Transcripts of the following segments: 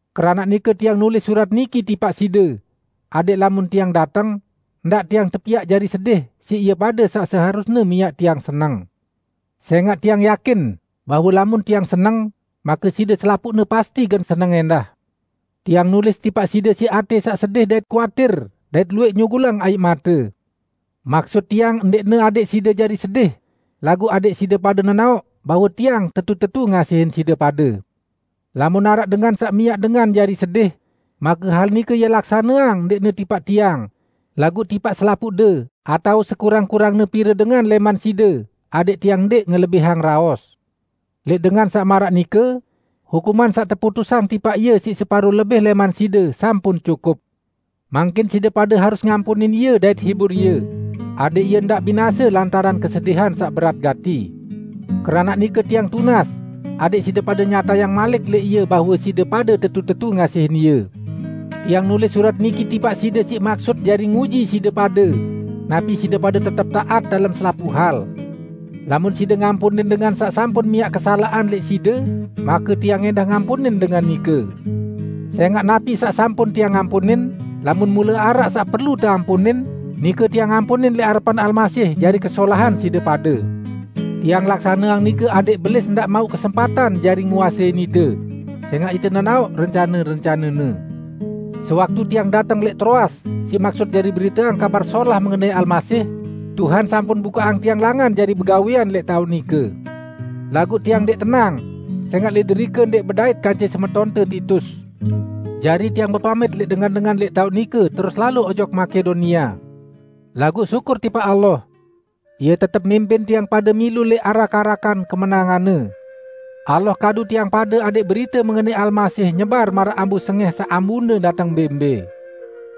Keranaq nike tiang nulis surat niki tipaq side, adẽq lamun tiang dateng, ndaq tiang tepiaq jari sedih siq ie pade saq seharusne miaq tiang seneng. Sẽngaq tiang yakin bahwe lamun tiang seneng, make side selapuqne pasti gen seneng ẽndah. Tiang nulis tipaq side siq atẽ saq sedih dait kuatir dait luwẽq nyugulang aiq mate. Maksut tiang ndẽqne adẽq side jari sedih, laguq adẽq side pade nenaoq bahwe tiang tetu-tetu ngasihin side pade. Lamun araq dengan saq miaq dengan jari sedih, make hal nike ie laksaneang ndẽqne tipaq tiang, laguq tipaq selapuqde atao sekurang-kurangne pire dengan lẽman side, adẽq tiang ndẽq ngelebihang raos. Lẽq dengan saq maraq nike, hukuman saq teputusang tipaq ie siq separo lebih lẽman side, sampun cukup. Mangkin side pade harus ngampunin ie dait hibur ie, adẽq ie ndaq binase lantaran kesedihan saq berat gati. Keranaq nike tiang tunas, adẽq side pade nyatayang malik lẽq ie bahwe side pade tetu-tetu ngasihin ie. Tiang nulis surat niki tipaq side siq maksut jari nguji side pade, napi side pade tetep taat dalem selapuq hal. Lamun side ngampunin dengan saq sampun miaq kesalaqan lẽq side make tiang ẽndah ngampunin dengan nike. Sẽngaq napi saq sampun tiang ampunin -- lamun mule araq saq perlu teampunin -- nike tiang ampunin lẽq arepan Almasih jari kesolahan side pade. Tiang laksaneang nike adẽq Belis ndaq mauq kesempatan jari nguasein ite; sẽngaq ite nenaoq rencane-rencanene. Sewaktu tiang dateng lẽq Troas siq maksut jari beriteang Kabar Solah mengenai Almasih, Tuhan sampun bukaqang tiang langan jari begawẽan lẽq taoq nike. Laguq tiang ndẽq tenang sẽngaq lẽq derike ndẽq bedait kance semetonte Titus. Jari tiang bepamit lẽq dengan-dengan lẽq taoq nike terus lalo ojok Makedonia. Laguq syukur tipaq Allah! Ie tetep mimpin tiang pade milu lẽq arak-arakan kemenangan-Ne. Allah kadu tiang pade adẽq berite mengenai Almasih nyebar maraq ambu sengẽh saq ambune dateng mbẽ-mbẽ.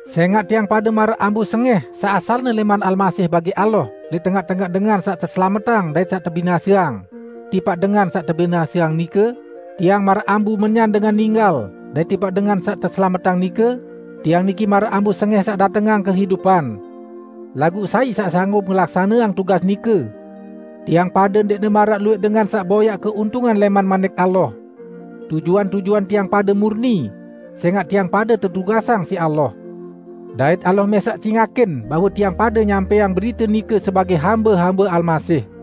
Sẽngaq tiang pade maraq ambu sengẽh saq asalne lẽman Almasih bagi Allah lẽq tengaq-tengaq dengan saq teselametang dait saq tebinaseang, tipaq dengan saq tebinaseang nike, tiang maraq ambu menyan dengan ninggal, dait tipaq dengan saq teselametang nike, tiang niki maraq ambu sengẽh saq datengang kehidupan. Laguq sai saq sanggup ngelaksaneang tugas nike? Tiang pade ndẽqne maraq luwẽq dengan saq boyaq keuntungan lẽman Manik Allah. Tujuan-tujuan tiang pade murni, sẽngaq tiang pade tetugasang siq Allah. Dait Allah mẽsaq cingakin bahwe tiang pade nyampẽang berite nike sebagẽ hambe-hambe Almasih.